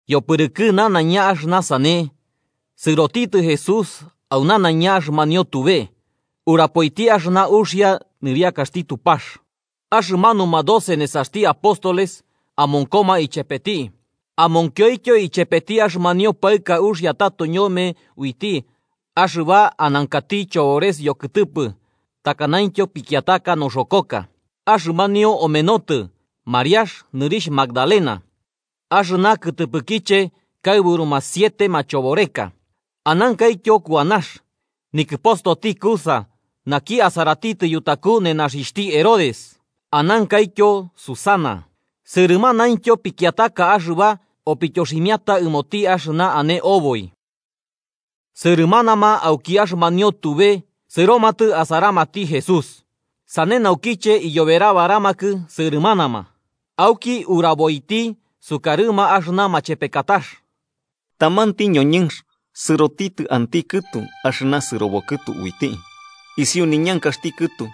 Yopɨrɨkɨ nanaiña axɨna sane, sɨrotitɨ Jesús au nanaiña axɨmanio tube, urapoiti axɨna uxia nɨriakaxti Tupax. Axɨmanuma doce nesaxti apóstoles amonkoma ichepeti, amonkioityo ichepeti axɨmanio paɨka uxia tato ñome uiti axɨba anankati chobores yokɨtɨpɨ takanaityo pikiataka noxokoka. Axɨmanio omenotɨ Mariax, nɨrixh Magdalena, axɨna kɨtɨpɨkiche kaɨburuma siete machoboreka. Anankaityo Kuanax, nikɨpostoti Cuza, naki asaratitɨ yutaku nenaxixhti Herodes. Anankaityo Susana. Sɨrɨmanaintyo pikiataka axɨba opityoximiata ɨmoti axɨna ane oboi. Sɨrɨmanama auki axɨmanio tube sɨromatɨ asaramati Jesús, sane naukiche iyoberabaramakɨ sɨrɨmanama. Auki uraboiti sukarɨma axɨna machepekatax: “Tamanti ñoñɨnx sɨrotitɨ anti kɨtu axɨna sɨrobo kɨtu uiti. Isiu ñankaxti kɨtu,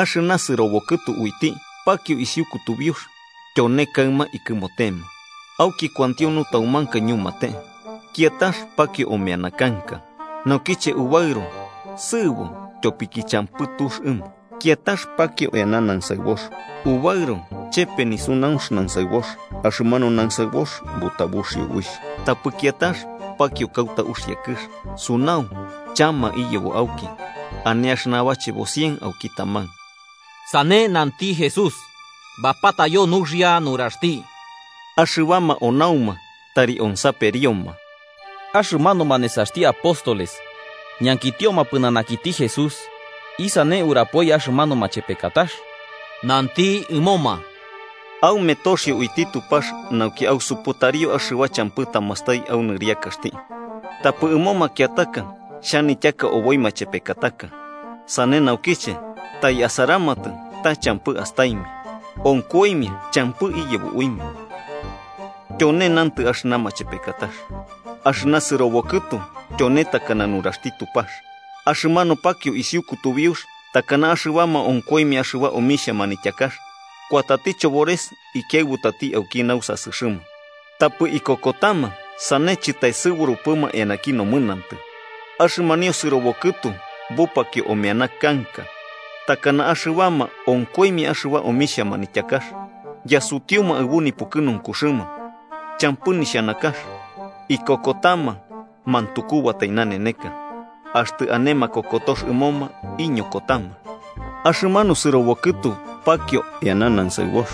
axɨna sɨrobo kɨtu uiti pakio isiu kutubiux, tyone kaɨma ikɨmotema, auki kuantio nutaumanka ñumate. Kiatax pakio omeana kanka. Naukiche ubaɨro, sɨɨbo tyopiki champɨ tux ɨmo. Kiatax pakio eana nansaɨbox. Ubaɨro chepe nisunaunx nansaɨbox, axɨmanu nansaɨbox butabuxio uixh. Tapɨ kiatax pakio kauta uxia kɨx. Sunau, chama iyebo auki, ane axɨna bachebo cien auki taman.” Sane nanti Jesús, bapatayo nuxia nuraxti: “¡Axɨbama onauma, tari onsaperioma!” Axɨmanuma nesaxti apóstoles ñankitioma pɨnanakiti Jesús isane urapoi axɨmanu machepekatax. Nanti ɨmoma: “Aume toxio uiti Tupax nauki ausuputario axɨba champɨ tamastai au nɨriakaxti. Tapɨ ɨmo makiataka xhanityaka oboi machepekataka, sane naukiche tai asaramatɨ ta champɨ astaimia, onkoimia champɨ iyebo uimia. “Tyone nantɨ axɨna machepekatax: Axɨna sɨrobo kɨtu tyone takana nuraxti Tupax. Axɨmanu pakio isiu kutubiux takana axɨbama onkoimia axɨba omixhia manityakax, kuatati chobores ikiaɨbutati auki nausasɨxɨma, tapɨ ikokotama sane chɨtaesɨburupɨma eanaki nomɨnantɨ. Axɨmanio sɨrobo kɨtu bupakio omeana kanka takana axɨbama onkoimia axɨba omixhia manityakax yasutiuma aɨbu nipukɨnunkuxɨma, champɨ nixhanakax. Ikokotama mantukubatai naneneka, axtɨ ane makokotox ɨmoma iñokotama. Axɨmanu sɨrobo kɨtu pakio eana nansaɨbox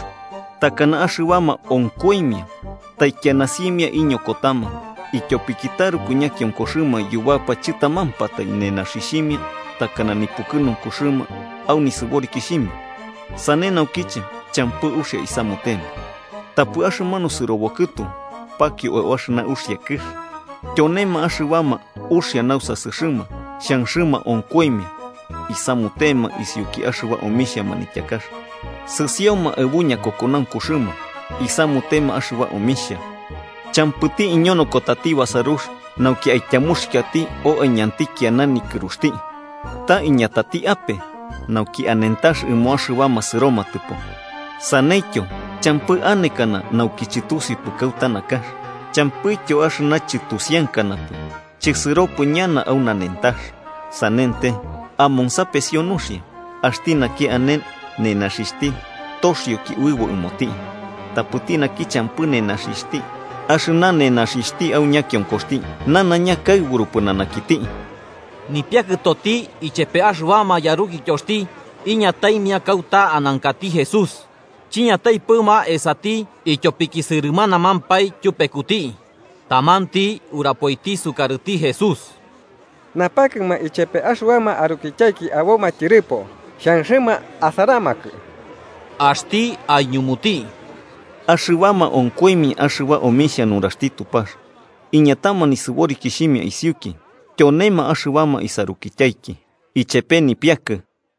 takana axɨbama onkoimia, taikiana simia iñokotama ityopiki taruku ñakionkoxɨma yubapa chɨtamampatai, nenaxixhimia takana nipukɨnunkuxɨma au nisɨborikixhimia, sane naukiche champɨ uxia isamutema. Tapɨ axɨmanu sɨrobo kɨtu pakio au axɨna uxia kɨx, tyonema axɨbama uxia nausasɨxɨma xhanxɨma onkoimia isamutema isiuki axɨba omixhia manityakax, sɨsioma aɨbu ñakokonaunkuxɨma, isamutema axɨba omixhia. “Champɨti iñonokotati basarux nauki aityamuxikiati o aiñanti kiana nikɨruxti, ta iñatati ape, nauki anentax ɨmo axɨbama sɨromatɨpo. Saneityo, champɨ anekana nauki chɨtusiupɨ kauta nakax, champɨityo axɨna chɨtusiankanapɨ chisɨropɨ ñana au nanentax. “Sanente, amonsapesio nuxia, axti naki ane nenaxixhti toxioki uɨbo ɨmoti. Tapɨti naki champɨ nenaxixhti, axɨna nenaxixhti au ñakionkoxti nanaiña kaɨburu pɨnanakiti.” Nipiakɨtoti ichepe axɨbama yarukityoxti iñataimia kauta anankati Jesús, chiñataipɨma esati ityopiki sɨrɨmanamampae tyupekuti. Tamanti urapoiti isukarɨti Jesús: –Napakɨma ichepe axɨbama arukityaiki aboma tyɨrɨpo, xhanxɨma asaramakɨ. Axti aiñumuti: –Axɨbama onkoimia axɨba omixhia nuraxti Tupax iñatama nisɨborikixhimia isiuki, tyonema axɨbama isarukityaiki ichepe nipiakɨ.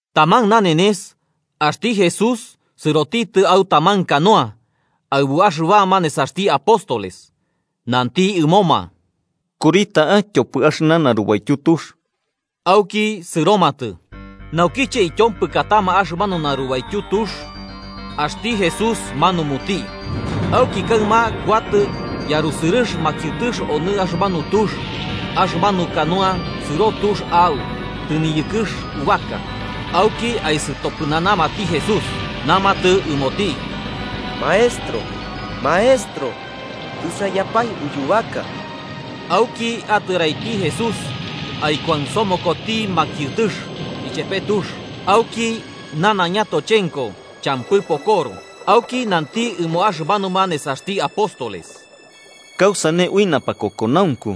Taman nanenes, axti Jesús sɨroti au taman canoa aɨbu axɨbama nesaxti apóstoles, nanti ɨmoma: –Kuri ta'a tyopɨ axɨna narubaityu tux. Auki, sɨromatɨ, naukiche ityompɨkatama axɨmanu narubaityu tux, axti Jesús manumuti. Auki kaɨma kuatɨ yarusɨrɨx makiɨtɨx onɨ axɨmanu tux, axɨmanu canoa sɨro tux a'u tɨniyɨkɨx ubaka. Auki aisɨtopɨnanamati Jesús, namatɨ ɨmoti: –¡Maestro! ¡Maestro! ¡Tɨsaiyapae uyubaka! Auki atɨraiti Jesús aikuansomokoti makiɨtɨx ichepe tux, auki nanaiña tochenko champɨ pokoro. Auki nanti ɨmo axɨmanuma nesaxti apóstoles: –¿Kausane ui napakokonaunku?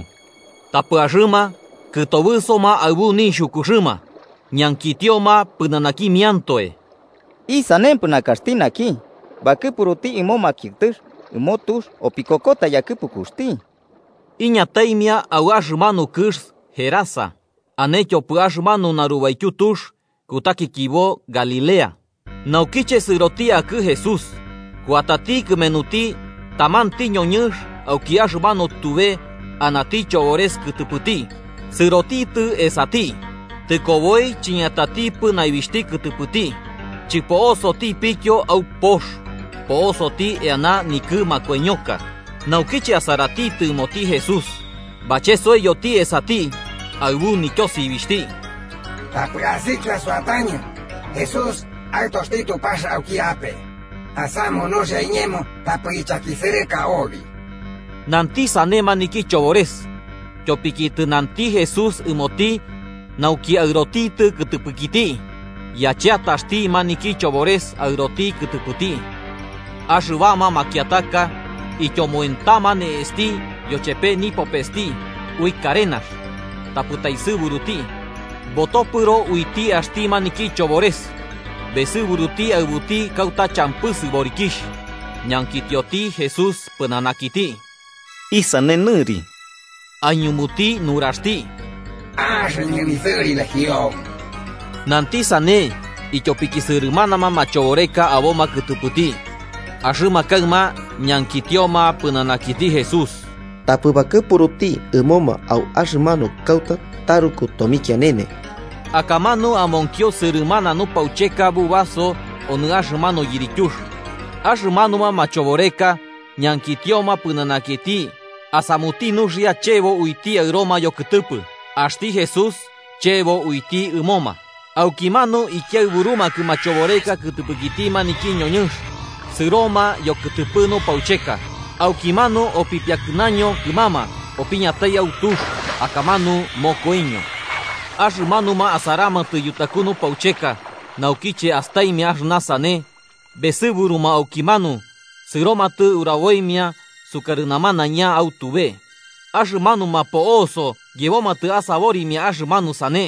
Tapɨ axɨma, kɨtobɨsoma aɨbu nixhukuxɨma, ñankitioma pɨnanakimiantoe: –¿Isanempɨ nakaxti naki, bakɨpuruti ɨmo makiɨtɨx ɨmo tux, opikokota yakɨpukuxti? Iñataimia au axɨmanu kɨx Gerasa, ane tyopɨ axɨmanu narubaityu tux, kutakikibo Galilea. Naukiche sɨroti akɨ Jesús, kuatati kɨmenuti tamanti ñoñɨnx auki axɨmanu tube anati chobores kɨtɨpɨti, sɨrotitɨ esati. Tɨkoboi chiñatatipɨ naibixhti kɨtɨpɨti chɨpo'osotipityo au pox, po'osoti eana nikɨ makoiñoka. Naukiche asaratitɨ ɨmoti Jesús, bachesoiyoti esati, aɨbu nityosibixhti: –¡Tapɨ asikia suatañɨ, Jesús, Aɨtoxti Tupax auki ape! ¡Asamu nuxia iñemo tapɨ ichakisɨrɨka obi! Nanti sane maniki chobores tyopiki tɨnanti Jesús ɨmoti nauki aɨrotitɨ kɨtɨpɨkiti. Yacheataxti maniki chobores aɨroti kɨtɨpɨti. Axɨbama makiataka ityomoentama ne'esti yochepe nipopesti ui karenax tapɨ taesɨburuti, botopɨro uiti axti maniki chobores besɨburuti aɨbuti kauta champɨ sɨborikixh. Ñankitioti Jesús pɨnanakiti: –¿Isane nɨri? Aiñumuti nuraxti: –Axɨñɨ nisɨri Legión. Nanti sane ityopiki sɨrɨmanama machoboreka aboma kɨtɨpɨti, axɨma kaɨma ñankitioma pɨnanakiti Jesús tapɨ bakɨpuruti ɨmoma au axɨmanu kauta taruku tomikianene. Akamanu amonkio sɨrɨmana nupaucheka bubaso onɨ axɨmanu yirityux, axɨmanuma machoboreka ñankitioma pɨnanakiti asamuti nuxia chebo uiti aɨroma yokɨtɨpɨ. Axti Jesús chebo uiti ɨmoma. Aukimanu ikiaɨburumakɨ machoboreka kɨtɨpɨkiti maniki ñoñɨnx sɨroma yokɨtɨpɨ nupaucheka, aukimanu opipiakɨnaño kɨmama opiñatai au tux, akamanu mokoiño. Axɨmanuma asaramatɨ yutaku nupaucheka, naukiche astaimia axɨna sane, besɨburuma aukimanu sɨromatɨ uraboimia sukarɨ namanaiña au tube. Axɨmanuma po'oso yebomatɨ asaborimia axɨmanu sane.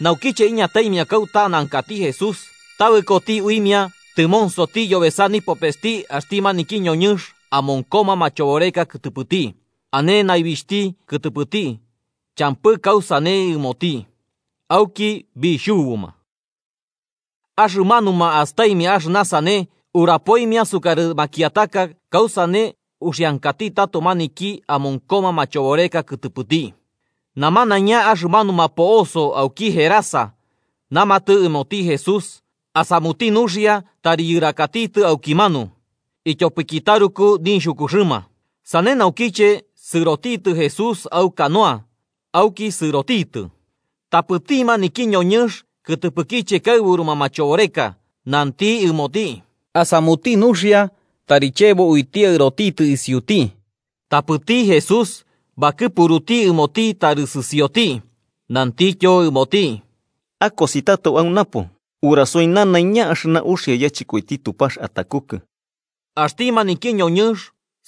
Naukiche iñataimia kauta anankati Jesús, tabɨkoti uimia tɨmonsoti yobesa nipopesti axti maniki ñoñɨnx amonkoma machoboreka kɨtɨpɨti, ane naibixhti kɨtɨpɨti champɨ kausane ɨmoti. Auki bixhubuma. Axɨmanuma astaimia axɨna sane, urapoimia sukarɨ makiataka kausane uxiankati tato maniki amonkoma machoboreka kɨtɨpɨti. Namanaiña axɨmanuma po'oso auki Gerasa namatɨ ɨmoti Jesús asamuti nuxia tari yɨrakatitɨ aukimanu, ityopiki taruku nixhukuxɨma. Sane naukiche sɨroti Jesús au canoa auki sɨrotitɨ. Tapɨti maniki ñoñɨnx kɨtɨpɨkiche kaɨburuma machoboreka nanti ɨmoti asamuti nuxia tari chebo uiti aɨrotitɨ isiuti, tapɨti Jesús bakɨpuruti ɨmoti tari sɨsioti, nantityo ɨmoti: 39–Akosi tato au napo urasoi nanaiña axɨna uxia yachɨkoiti Tupax atakukɨ. Axti maniki ñoñɨnx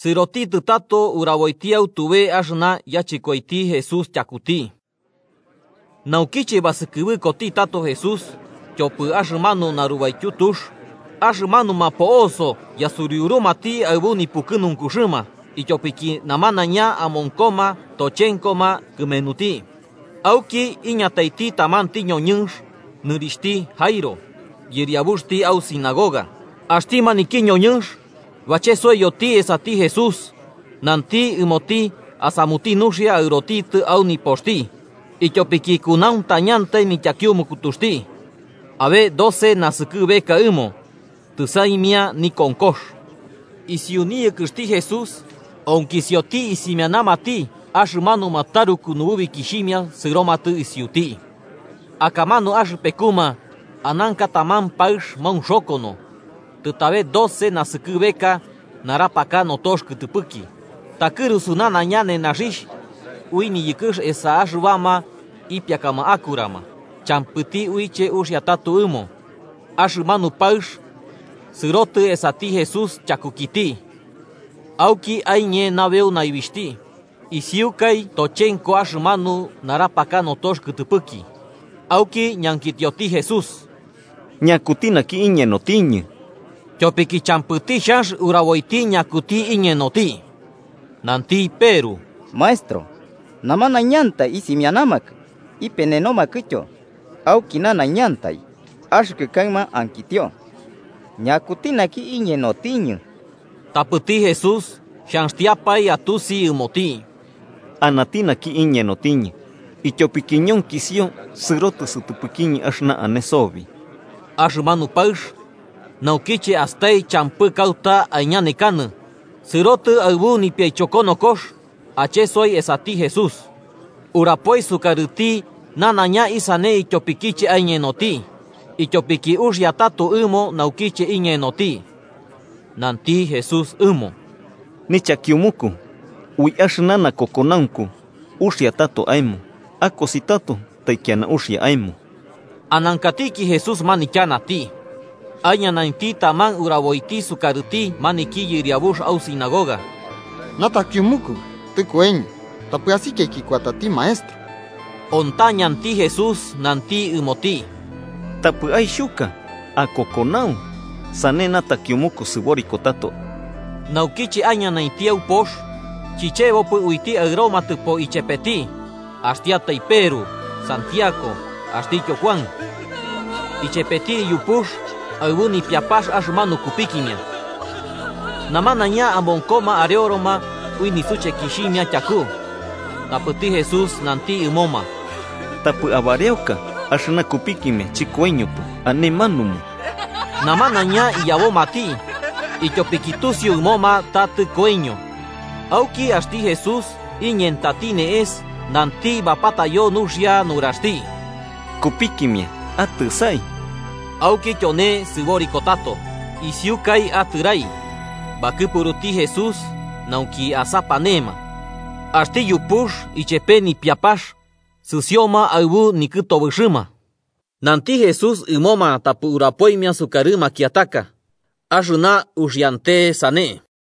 sɨrotitɨ tato uraboiti au tube axɨna yachɨkoiti Jesús tyakuti. Naukiche basɨkɨbɨkoti tato Jesús tyopɨ axɨmanu narubaityu tux, axɨmanuma po'oso yasuriurumati aɨbu nipukɨnunkuxɨma, ityopiki namanaiña amonkoma tochenkoma kɨmenuti. Auki iñataiti tamanti ñoñɨnx nɨrixhti Jairo, yɨriabuxti au sinagoga. Axti maniki ñoñɨnx bachesoiyoti esati Jesús nanti ɨmoti asamuti nuxia aɨrotitɨ au nipoxti, ityopiki kunauntañantai nityakiumukutuxti, abe doce naskɨbeka ɨmo, tɨsaimia nikonkox. Isiu niyɨkɨxti Jesús, onkisioti isimianamati axɨmanuma taruku nububikixhimia sɨromatɨ isiuti. Akamanu axɨpekuma ananka taman paɨx maunxokono, tɨtabe doce naskɨbeka narapaka notox kɨtɨpɨki, takɨrusu nanaiña nenaxixh ui niyɨkɨx esa axɨbama ipiakama akurama, champɨti uiche uxia tato ɨmo. Axɨmanu paɨx sɨrotɨ esati Jesús chakukiti auki aiñe nabeu naibixhti, isiukai tochenko axɨmanu narapaka notox kɨtɨpɨki. Auki ñankitioti Jesús: –¿Ñakuti naki iñenotiñɨ? Tyopiki champɨti xhanx uraboiti ñakuti iñenoti, nanti Peru: –Maestro, namanaiñantai isimianamakɨ ipenenomakɨtyo auki nanaiñantai. Axɨkɨ kaɨma ankitio, ¿ñakuti naki iñenotiñɨ? Tapɨti Jesús xhanxtiapae atusi ɨmoti: –Anati naki iñenotiñɨ, ityopiki ñonkisio sɨrotɨ sɨtɨpɨkiñɨ axɨna ane sobi. Axɨmanu paɨx, naukiche astai champɨ kauta aiñanekanɨ, sɨrotɨ aɨbu nipiaichokonokox achesoi esati Jesús. Urapoi sukarɨti namanaiña isane ityopikiche aiñenoti, ityopiki uxia tato ɨmo naukiche iñenoti. Nanti Jesús ɨmo: –Nichakiumuku, ui axɨna nakokonaunku uxia tato aemo. Akosi tato taikiana uxia aemo. Anankatiki Jesús manityanati, aiñanainti taman uraboiti sukarɨti maniki yɨriabux au sinagoga: –Natakiumuku tɨkoiño. Tapɨ asikiaiki kuatati Maestro. Ontañanti Jesús nanti ɨmoti: –Tapɨ aixhuka. Akokonau, sane natakiumuku sɨboriko tato. Naukiche aiñanainti au pox, chichebopɨ uiti aɨromatɨpo ichepeti axtiatai Peru, Santiago, axtityo Kuan, ichepeti iyupux aɨbu nipiapax axɨmanu kupikimia. Namanaiña amonkoma areoroma ui nisuchekixhimia tyaku, tapɨti Jesús nanti ɨmoma: –Tapɨ abareoka. Axɨna kupikimia chɨkoiñopɨ, ane manumu. Namanaiña iyabomati, ityopiki tusiu ɨmoma ta tɨkoiño. Auki axti Jesús iñentati ne'es nanti bapatayo nuxia nuraxti: –¡Kupikimia, atɨsai! Auki tyone sɨboriko tato. Isiukai atɨrai, bakɨpuruti Jesús nauki asapanema. Axti yupux ichepe nipiapax sɨsioma aɨbu nikɨtobɨxɨma. Nanti Jesús ɨmoma tapɨ urapoimia sukarɨ makiataka axɨna uxiante sane.